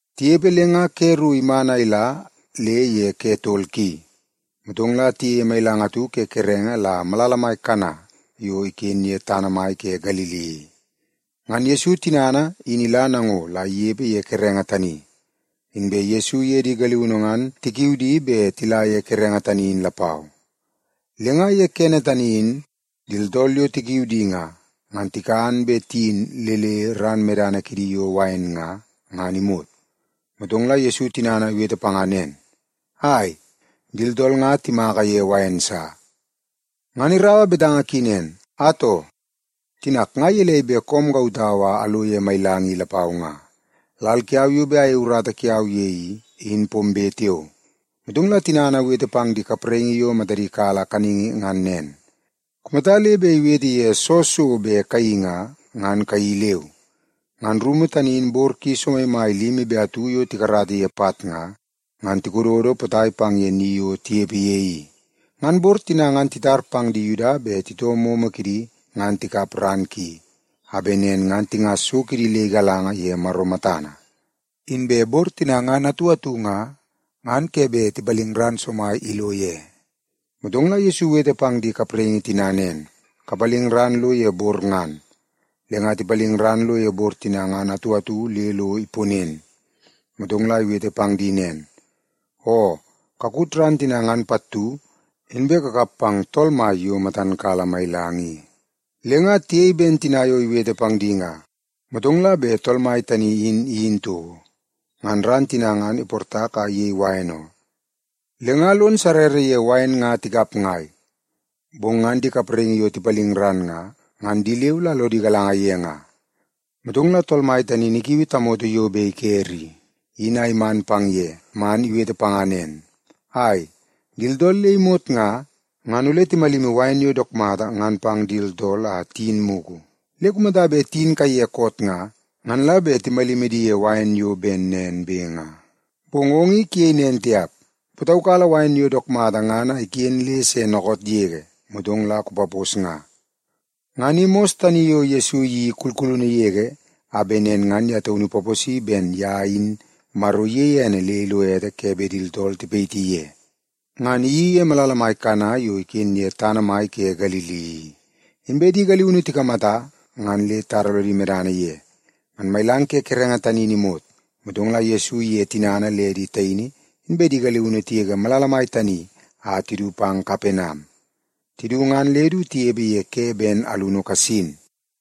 Tinepe le nga ke ru iman a ila le ye ke tol ki, motong la tiyeie mailang atu ke kerenge la malala mai Kana yo iken ye tana mai ke Galili i. Ngan Yesu tinana in ila nango la inepe ye kerenge tani. Inbe Yesu iye di galiunu ngan tikiu di bet tila ye kerenge tani in lapau. Le nga ye kene tani in, di tooltool yo tikiu di nga, ngan tikan be tiyin le le ran medana kidi yo wain nga, ngan imot. Motong la Yesu tinana iwete panga nen, “Ai, di tooltool nga timaka ye wain sa.” Ngan iraua betanga ki nen, “Atoo, tinak nga gelei bet koom kautau a alo ye mailang i lapau nga? Lal kiau yo bet ayei urata kiau ye i, in pombe tiao.” Motong la tinana iwete pang di kapraingi yo matadi kala kaningi ngan nen, “Kumata le bet iwete pang ye soo so bet kayeii nga, ngan kayeii leu.” Ngan rumu tani in bor ki somaimai limi be atu yo tikarata ye pat nga, ngan tikododo potai pang ye ni yo tinepe ye i. Ngan bor tina ngan titar pang di Yuda bet titoo momo kidi ngan tikap ran ki, a bet nen ngan tingas so kidi le igalanga ye Maro matana. Inbe bor tina ngan atu atu nga, ngan ke bet tipaling ran le somai ilo ye. Motong la Yesu iwete pang di kapraingi tina nen, “Kapaling ran lo ye bor ngan.” Le nga tipaling ran lo ye bor tina ngan atu atu le lo iponen. Motong la iwete pang di nen, “Oo, kakut ran tina ngan pattu, inbe kakap pang tool mai yo matan kala mailang i.” Le nga tiyei ben tina yo iwete pang di nga. Motong la bet tool mai tani in iyin toko, ngan ran tina ngan iportak a iyei wain oo. Le nga lon sarrara ye wain nga tikap ngai, bong ngan di kapraingi yo tipaling ran nga, ngan di leu la lodi galanga ye nga. Motong la tool mai tani in ikiui tamoto yo bet ikere i, in a iman pang ye man, iwete panga nen, “Ai, di tooltool le imot nga, ngan ole timalimi wain yo dook mata ngan pang di tooltool a tiyin mugu. Le kumata bet tiyin kaiye koot nga, ngan la bet timalimi di ye wain yo ben nen be nga. Bong ong i kuyei nen tiap, kupataukala wain yo dook mata ngan a iken le se dookoot yege, motong la kupapos nga.” Ngan i mos tani yo Yesu iyeii kulkulunu yege a bet nen ngan ye taunu ipaposi ben ye in Maro iyeie ene le ilo ete ke bet di tooltool tipayiti ye. Ngan iyeii ye malala mai Kana yo iken ye tana mai ke Galili i. Inbe di galiunu tikamata, ngan le titara lodi medana ye. Ngan mailang ke kerenge tani in imot, motong la Yesu iye tinana le di taini inbe di galiunu tigege malala mai tani a tidu pang Kapenam. Tidu, ngan le du tinepe ye ke ben alunu kasin.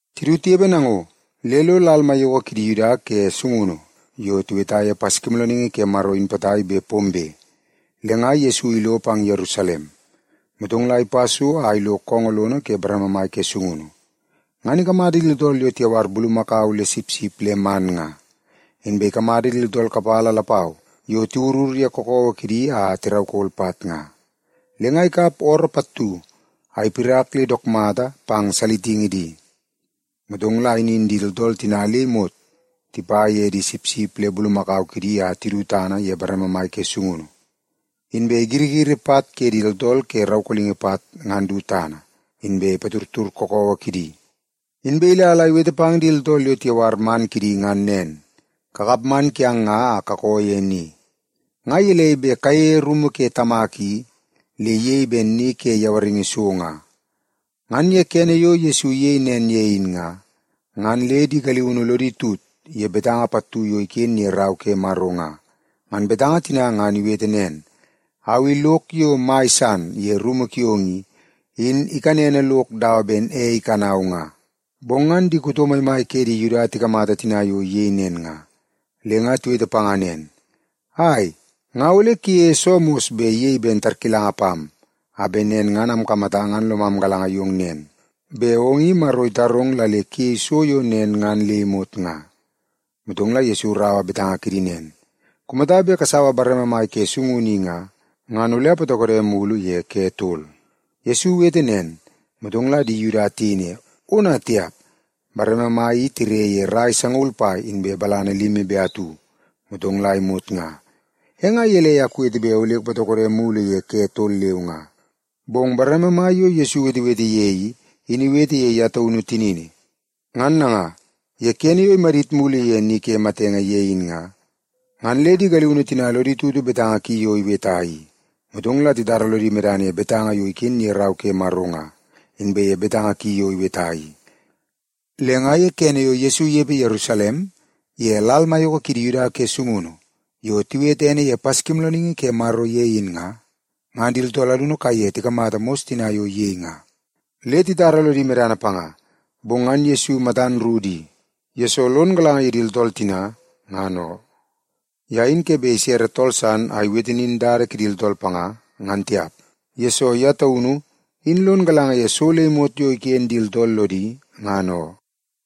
Tidu tinepe nango, le lo lal maiyoko kidi Yuda ke sungunu yo tiweta ye Paskimoolooningi ke Maro in potai bet pombe, le nga Yesu ilo pang Yerusalem. Motong la ipa so a ilo koongoo lono ke bareme mai ke sungunu, ngan ikamata di tooltool yo tiyawar bulumakau le sipsip le man nga. Inbe ikamata di tooltool kapala lapau yo tiwurur ye kakawa kidi a tiraukol pat nga. Le nga ikap ooroo pattu a ipirak le dook mata pang salitingi di. Motong la inin di tooltool tina le imot tipa ye di sipsip le bulumakau kidi a tidu tana ye bareme mai ke sungunu. Inbe igirigiri pat ke di tooltool ke raukolingi pat ngan du tana, inbe ipatudtud kakawa kidi. Inbe ila la iwete pang di tooltool yo tiyawar man kidi ngan nen, “Kakap man kiang nga a kakoo ye ni! Nga gelei bet kayeie rumu ke Tamak i, le iyei ben ni ke yawaringi so nga!” Ngan ye kene yo Yesu iyei nen ye in nga, ngan le di galiunu lodi tut ye betanga pattu yo iken ye Rau ke Maro nga. Ngan betanga tina ngan iwete nen, “Au i lok yo mai san ye rumu kiong i, in ikanene lok dawa ei ikanau nga.” Bong ngan di kuto maimai ke di Yuda tikamata tina yo iyei nen nga, le nga tiwete panga nen, “Ai, nga ole kuyeie soo mos bet iyei ben tarkilanga pam, a bet nen ngan amkamata ngan lomam galanga yong nen, bet ong i Maro itarong la le kuyei so yo nen ngan le imot nga?” Motong la Yesu iraua betanga kidi nen, “Kumata bet kasaua bareme mai ke sungunu i nga, ngan ole apatokode mulu ye ke tol.” Yesu iwete nen, motong la di Yuda tiyei ne, “Ona tiap, bareme mai i tire ye rai sangaul pai inbe balana limi be atu, motong la imot nga. E nga gelei a kuwete bet ole kupatokode mulu ye ke tol leu nga?” Bong bareme mai yo Yesu iwetewete ye i, in iwete ye ye taunu tinini. Ngan nanga, ye kene yo imadit mulu ye ni ke matenge ye in nga, ngan le di galiunu tina lodi tutu betanga ki yo iweta i. Motong la titara lodi medana ye betanga yo iken ye Rau ke Maro nga, inbe ye betanga ki yo iweta i. Le nga ye kene yo Yesu inepe Yerusalem ye lal maiyoko ke di Yuda ke sungunu yo tiwete ene ye Paskimoolooningi ke Maro ye in nga, ngan di tooltool alunu kaiye tikamata mos tina yo iyei nga, le titara lodi medana panga. Bong ngan Yesu matan ru di, yesoo lon galanga ye di tooltool tina, ngan oo. Ye in ke bet isere tool san a iwete nin dada kidi tooltool panga, ngan tiap. Yesoo ye taunu, in lon galanga ye so le imot yo iken di tooltool lodi, ngan oo.